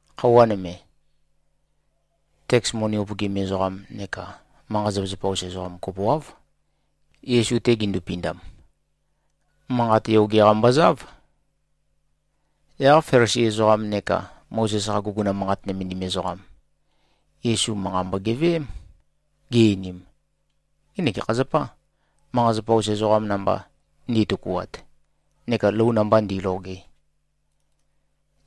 Khøuwa nøme, teks moni upøgim ezoqam neka manqa-zapa-us ezoqam kopoáv, Yesu-te gindupindam. Manqat yoge-qa mbozáv. Yaq Felisi ezoqam neka Mozes-qa guguna manqat nømendim ezoqam, Yesu manqa mbogeveém, gi-einim, “Ngenek gekha zapâ, manqa-zapa-us ezoqam namba ndi꞉tøkuat neka lou namba ndi꞉loge?”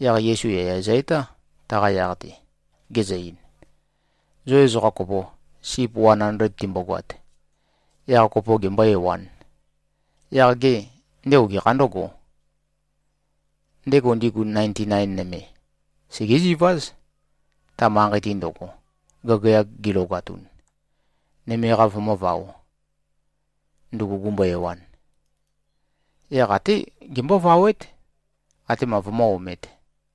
Yaq Yesu yaya zø-etá, taqa yaq-te, gezø-ein, “Zo ezoqa kopo, sip wan andled timbogoat, yaq kopo gembō-ewān, yaq gê, ndego gekhā ndǿgō? Ndego ndigu nainti-nain nøme, segéziváz, ta manqei-te ndøgo, gagayag gilogatun, nøme-qa vømǿvaō, ndugu gumbo-ewan. Yaq até gembóvawét, atema vømǿ-omēt.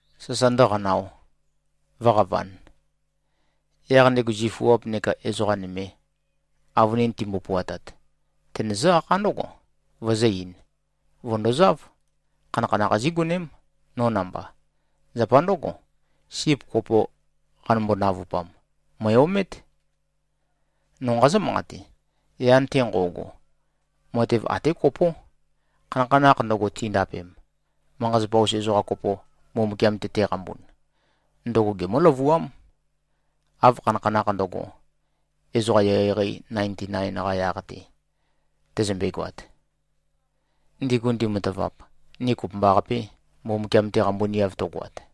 sasa ndǿqanāo, vǿqavān. Yaq ndego zifuap neka ezoqa nøme, avønin timbo-puatat, tenøzǿ-akhá ndǿgo, vøzǿ-eīn, ‘Vø̀ndozáv. Khanakhanakh zígoném, no namba. Zapa ndǿgo, sip kopo qanømbo-navupam, mø̀e-omét.’ No nqazǿ-manqate: Yan-te nqo꞉go, matev até kopó. Khanakhanakh ndøgo, tindapem, manqa-zapa-us ezoqa kopo, Mbumbukiam-te teqambun, ndøgo gemǿ-løvuám, av khanakhanakh ndøgo, ezoqa eqeieqei nainti-nain-qa yaq-te tøzømbe-goat, ndigu ndimatavap, ni kopømbaqapē Mbumbukiam-te qambuniav tøgoat.”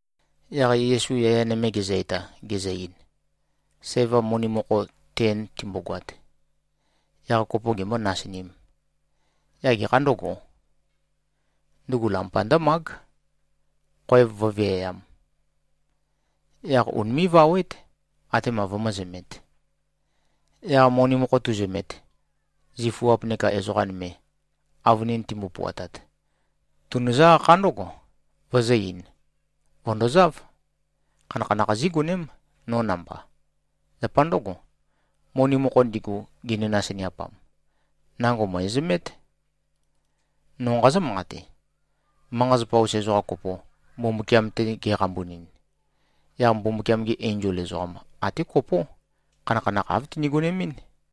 Yaq Yesu yaya nøme gezø-eta, gezø-ein, “Sæva moni mokho ten timbogoat, yaq kopo gembō-nasinīm, yaq gekhā ndǿgō? Ndugu lampa ndǿmág, khoev vǿviayām. Yaq unimé꞉-vawét, atema vømǿzømēt. Yaq moni mokho tuzømet, zifuap neka ezoqa nøme, avønin timbo-puatat, tunøzǿ-akhá ndǿgo, vøzǿ-eīn, ‘Vø̀ndozáv. Khanakhanakh zígoném, no namba. Zapa ndǿgo, moni mokho ndigu, ginø-nasiniapam, nango mø̀ezømét.’ No nqazǿ-manqate: Manqa-zapa-us ezoqa kopo, Mbumbukiam-te geqambunin, yaq Mbumbukiam-gi enzol ezoqam, até kopó, khanakhanakh āv tini-gonemɨ́n.”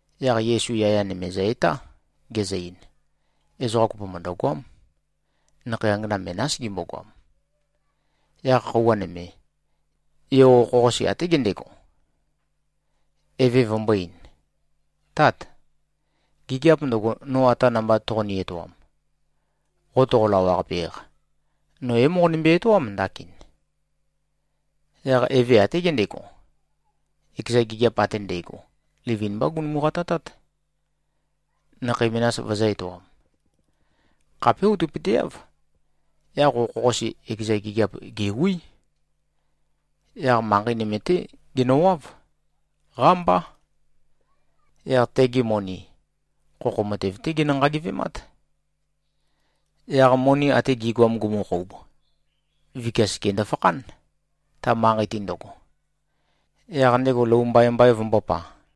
Yaq Yesu yaya nøme zø-etá, gezø-ein, “Ezoqa kopo mø̀ndøgoám. Nakhei angana menás gimbogoam. Yaq khøuwa nøme, yo okho-qase até gendego, eve vømbō-ein, ‘Tát! Gigiap ndøgo, no ata namba toqoni-etoam, qo toqo-lawaqape-eq, no é-moqonømbe-etoám ndakin.’ Yaq eve até gendego, ekeza gigiap ate ndægo, livin-mbá gunumu-qatatát, nakhei menas vøzø̄-etoam. Khapé outøpøteáv, yaq okho-qase ekeza gigiap gèwí. Yaq manqei nøme-té genøwáv. Qámbá. Yaq tegi moni, khokho matev-té genø-nqagivemát. Yaq moni até gi꞉goam gumukhoub, vikia seke ndøfakhán, ta manqei-te ndøgo, yaq ndego lou mbaimbai vømbōpa.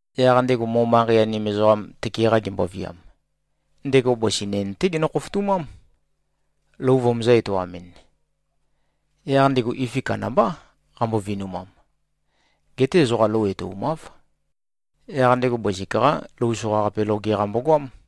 Yaq ndego mo-manqei-anim ezoqam tøke-qa gemboviam, ndego bøsi nen-té genø-khofotumám, lou vømøzø̄-etoamɨn. Yaq ndego ifi kandambá qambo-vinumam. Geté ezoqa lou etoumáv. Yaq ndego bøsik-qá lou soqaqape loge-qa mbogoám.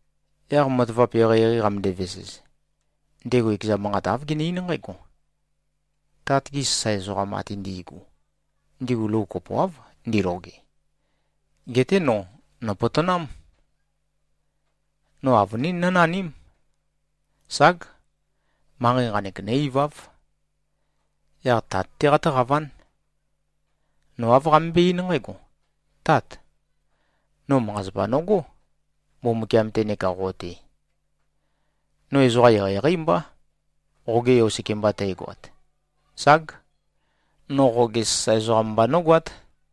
Yaq matavap eqeieqei qamøndæ-vesez, ndego ekeza manqat āv gene-eín nqǽgo, ‘Tat-gi sasae ezoqam ate ndi꞉gu, ndigu lou kopoáv ndiloge. Geté no, nòpotonám. No avønín nǿnaním. Ság! Manqei nqanek, nǿ-iváv. Yaq tat-té qatǿqaván. No āv qamømbó-eín nqǽgo, “Tát! No manqa-zapa nogó, Mbumbukiam-te neka qo-te. No ezoqa eqeieqeí mbá, qoge yo sekemba tægoat. Ság. No qoge sasae ezoqam mba nógoát.” ’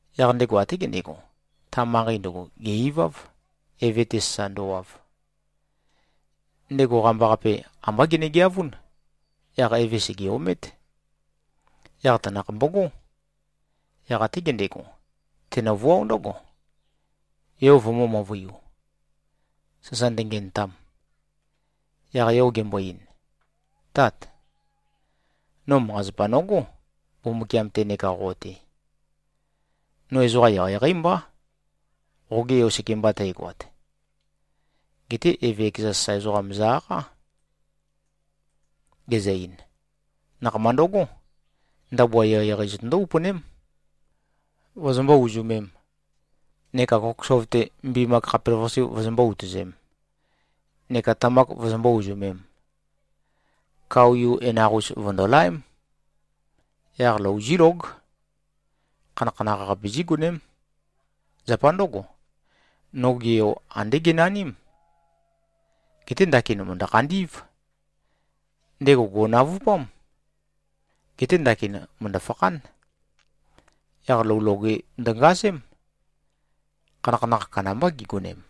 Yaq ndego até gendego, ta manqei ndøgo gè-iváv, eve-te sasa ndøwav. Ndego qambaqape, ambá genegeavún. Yaq eve sège-omét. Yaq tanakh mbogó. Yaq até gendego, tenøvuáo ndǿgo, yo vømø̄-møvøiu, sasa ndøngenøtam. Yaq yo gembo-ein, ‘Tát! No manqa-zapa nogó, Mbumbukiam-te neka qo-te. No ezoqa eqeieqeí mbá, qoge yo sekemba tægoat.’ Geté eve ekeza sasae ezoqam zø-akhá, gezø-ein, ‘Nakhama ndøgó! Ndabua eqeieqei zotøndó-upøném, vozombó-uzømēm, neka kokosov-te mbimak khapelavøqasi vozombó-utøzēm neka tamak vozombó-uzømēm. Kao-yu enaq-us vø̀ndolaém. Yaq lou zílóg. Khanakhanakh-qape zígoném. Zapa ndǿgo, noge yo, andé genaním. Geté ndakin, mø̀ndø-khandí꞉v. Ndego gò꞉navupám. Geté ndakin, mø̀ndø-fakhán.’ Yaq lou loge ndøngazém. Khanakhanakh kandambá gigonem.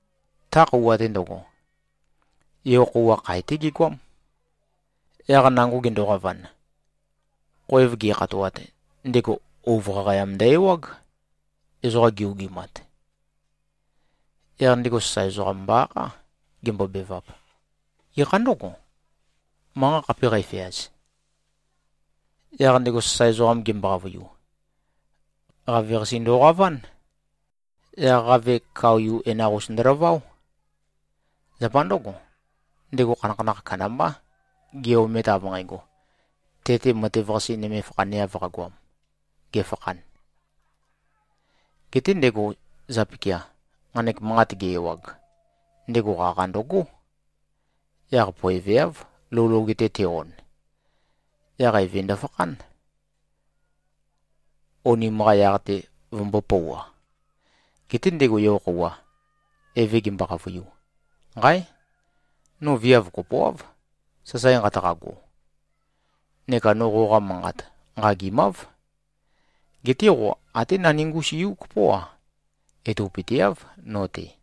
Ta khøuwa-te ndøgo, yo-khøuwa, khae-té gegoám. Yaq nango gendoqavan, khoev ge꞉khatoat, ndego ouv qaqayam ndø-ewág, ezoqa gi-ogimat. Yaq ndego sasae ezoqam mbo-akhá, gembobevap, ‘Gekhā ndǿgo, manqa khape qæfeaz?’ Yaq ndego sasae ezoqam gembo-qavøiu, ‘Qaveqase ndoqaván. Yaq qave, kao-yu enaq-us ndølaváo. Zapa ndǿgo, ndego khanakhanakh kandambá, ge-omet av nqægo, te-te matev-qase nøme fakhaneav qagoam, gefakhan.’ Geté ndego zapikia, nqanek manqat ge-ewag, ndego qaqa ndøgó. Yaq poeveáv, lou loge-te te-on. Yaq eve ndøfakhán, onim-qa yaq-te vømømbō-pouwa. Geté ndego yo-khøuwa, eve gembo-qavøiu, ‘Nqáe! No viav kopoáv, sasae nqataqago. Neka no qoqa manqat nqagimáv. Geté qo até naningus-yu kopó-a, etopøteáv no-te,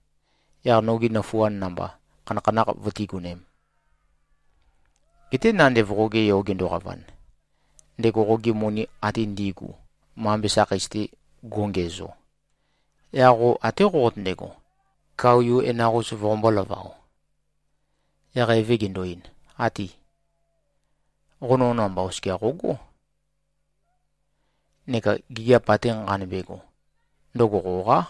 yaq nogi nøfuand namba khanakhanakh vøtígonēm. Geté nandev qoge yo gendoqavan, ndego qogi moni ate ndi꞉gu mambe sakheis-te go꞉ngiæzo, yaq qo até qoqotøndego, kao-yu enaq-us voqombō-lavao.’ Yaq eve gendo-ein, ‘Áti. Qo no namba oskia qogó. Neka gigiap ate nqanømbe꞉go, ndøgo qoqá.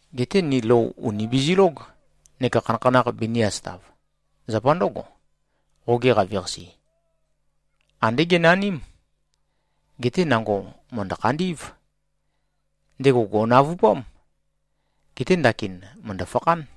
Geté ni lou ùni bizilóg neka khanakhanakh binī-asøtav. Zapa ndǿgo, qoge qaveqase, andé genaním. Geté nango mø̀ndø-khandí꞉v. Ndego gò꞉navupám. Geté ndakin, mø̀ndø-fakhán.’”